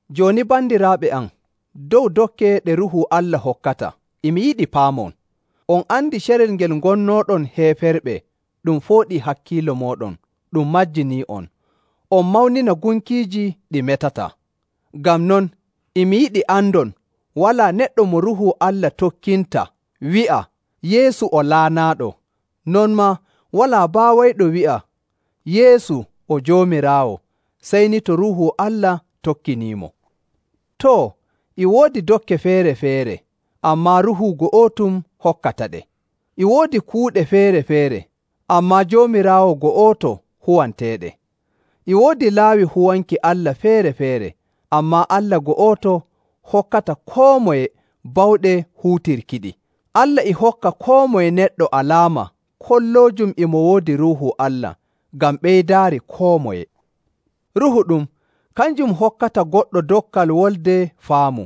Jooni bandiraaɓe am, dow dokke ɗe Ruuhu Allah hokkata, e mi yiɗi paamon. On andi carel ngel ngonnooɗon heeferɓe ɗum fooɗii hakkiilo mooɗon ɗum majjinii'on, on mawnina gunkiiji ɗi metataa. Ngam non, e mi yiɗi andon walaa neɗɗo mo Ruuhu Allah tokkinta wi'a, “Yeesu o laanaaɗo!” Non maa walaa baawayɗo wi'a, “Yeesu o Joomiraawo,” sey ni to Ruuhu Allah tokkiniimo. Too, e woodi dokke feere‑feere, ammaa Ruuhu go'otum hokkataɗe. E woodi kuuɗe feere‑feere, ammaa Joomiraawo go'oto huwanteeɗe. E woodi laawi huwanki Allah feere‑feere, ammaa Allah go'oto hokkata koo moye bawɗe huutirkiɗi. Allah e hokka koo moye neɗɗo alaama kolloojum e mo woodi Ruuhu Allah ngam ɓeydaari koo moye. Ruuhu ɗum, kanjum hokkata goɗɗo dokkal wolde faamu,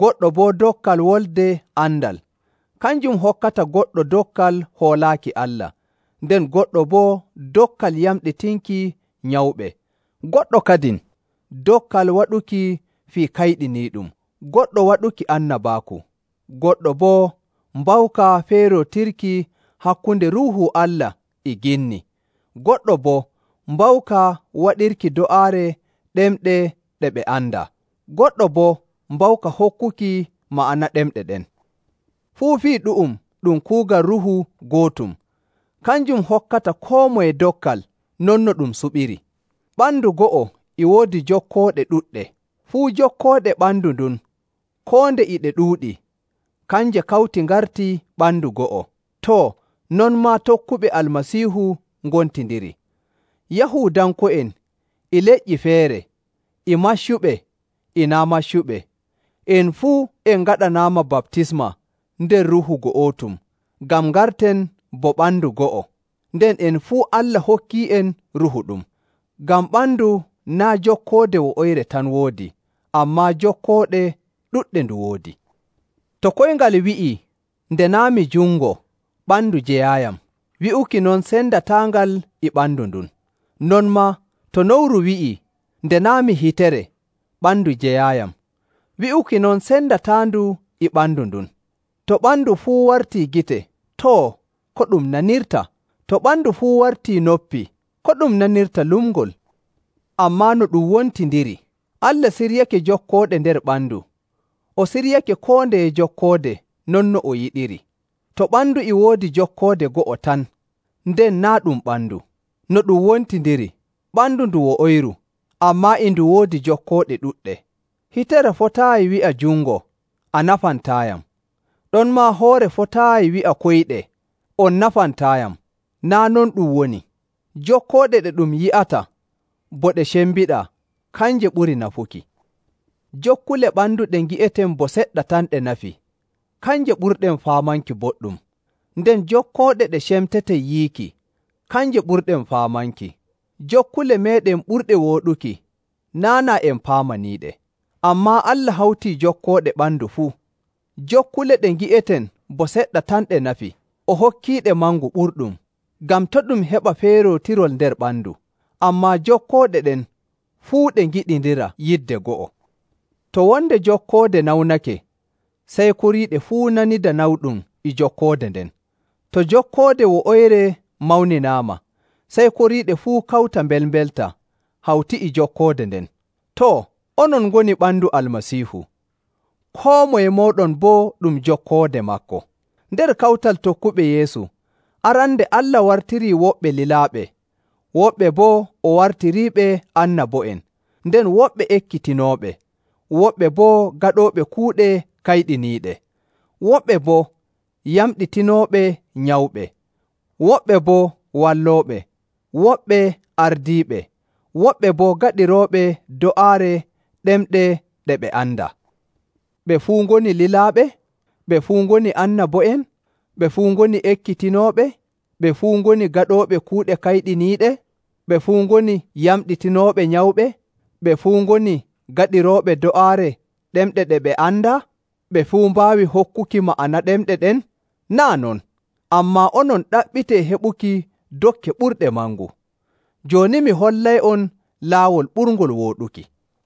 goɗɗo boo dokkal wolde andal. Kanjum hokkata goɗɗo dokkal hoolaaki Allah, nden goɗɗo boo dokkal yamɗitinki nyawɓe, goɗɗo kadin dokkal waɗuki fii kayɗiniiɗum, goɗɗo waɗuki annabaaku, goɗɗo boo mbawka feerootirki hakkunde Ruuhu Allah e ginni, goɗɗo boo mbawka waɗirki do'aare ɗemɗe ɗe ɓe andaa, goɗɗo boo mbawka hokkuki ma'ana ɗemɗe ɗen. Fuu fii ɗu'um ɗum kuugal Ruuhu go'otum, kanjum hokkata koo moye dokkal non no ɗum suɓiri. Ɓandu go'o e woodi jokkooɗe ɗuɗɗe. Fuu jokkooɗe ɓandu ndun koo nde e ɗe ɗuuɗi, kanje kawti ngarti ɓandu go'o. Too, non maa tokkuɓe Almasiihu ngontindiri. Yahuudanko'en, e leƴƴi feere, e maccuɓe, e naa' maccuɓe, en fuu en ngaɗanaama baptisma nder Ruuhu go'otum ngam ngarten bo ɓandu go'o, nden en fuu Allah hokkii'en Ruuhu ɗum. Ngam ɓandu naa' jokkoode wo'oyre tan woodi, ammaa jokkooɗe ɗuɗɗe ndu woodi. To koyngal wi'ii, “Nde naa' mi jungo, ɓandu jeyaayiyam,” wi'uki non sendataangal e ɓandu ndun. Non maa to nowru wi'ii, “Nde naa' mi hitere, ɓandu jeyaayiyam,” wi'uki non sendataandu e ɓandu ndun. To ɓandu fuu wartii gite, too, ko ɗum nanirta? To ɓandu fuu wartii noppi, ko ɗum nanirta lumngol? Ammaa no ɗum wontindiri, Allah siryake jokkooɗe nder ɓandu, o siryake koo ndeye jokkoode non no o yiɗiri. To ɓandu e woodi jokkoode go'o tan, nden naa' ɗum ɓandu. No ɗum wontindiri, ɓandu ndu wo'oyru, ammaa e ndu woodi jokkooɗe ɗuɗɗe. Hitere fotaayi wi'a jungo, “A nafantaayam.” Ɗonmaa hoore fotaayi wi'a koyɗe, “On nafantaayam.” Naa' non ɗum woni. Jokkooɗe ɗe ɗum yi'ata bo ɗe cembiɗaa, kanje ɓuri nafuki. Jokkule ɓandu ɗe ngi'eten bo seɗɗa tan ɗe nafi, kanje ɓurɗen faamanki boɗɗum, nden jokkooɗe ɗe cemteten yiiki, kanje ɓurɗen faamanki. Jokkule meeɗen ɓurɗe wooɗuki, naa' naa en paamaniiɗe. Ammaa Allah hawtii jokkooɗe ɓandu fuu. Jokkule ɗe ngi'eten bo seɗɗa tan ɗe nafi, o hokkiiɗe mangu ɓurɗum, ngam to' ɗum heɓa feerootirol nder ɓandu, ammaa jokkooɗe ɗen fuu ɗe ngiɗindira yidde go'o. To wonde jokkoode nawnake, sey koriiɗe fuu nanida nawɗum e jokkoode nden. To jokkoode wo'oyre mawninaama, sey koriiɗe fuu kawta mbelmbelta hawti e jokkoode nden. Too, onon ngoni ɓandu Almasiihu, koo moye mooɗon bo ɗum jokkoode maako. Nder kawtal tokkuɓe Yeesu, arande Allah wartirii woɓɓe lilaaɓe, woɓɓe boo o wartiriiɓe annabo'en, nden woɓɓe ekkitinooɓe, woɓɓe boo gaɗooɓe kuuɗe kayɗiniiɗe, woɓɓe boo yamɗitinooɓe nyawɓe, woɓɓe boo wallooɓe, woɓɓe ardiiɓe, woɓɓe boo gaɗirooɓe do'aare ɗemɗe ɗe ɓe andaa. Ɓe fuu ngoni lilaaɓe? Ɓe fuu ngoni annabo'en? Ɓe fuu ngoni ekkitinooɓe? Ɓe fuu ngoni gaɗooɓe kuuɗe kayɗiniiɗe? Ɓe fuu ngoni yamɗitinooɓe nyawɓe? Ɓe fuu ngoni gaɗirooɓe do'aare ɗemɗe ɗe ɓe andaa? Ɓe fuu mbaawi hokkuki ma'ana ɗemɗe ɗen? Naa' non! Ammaa onon ɗaɓɓitee heɓuki dokke ɓurɗe mangu. Jooni mi hollay'on laawol ɓurngol wooɗuki.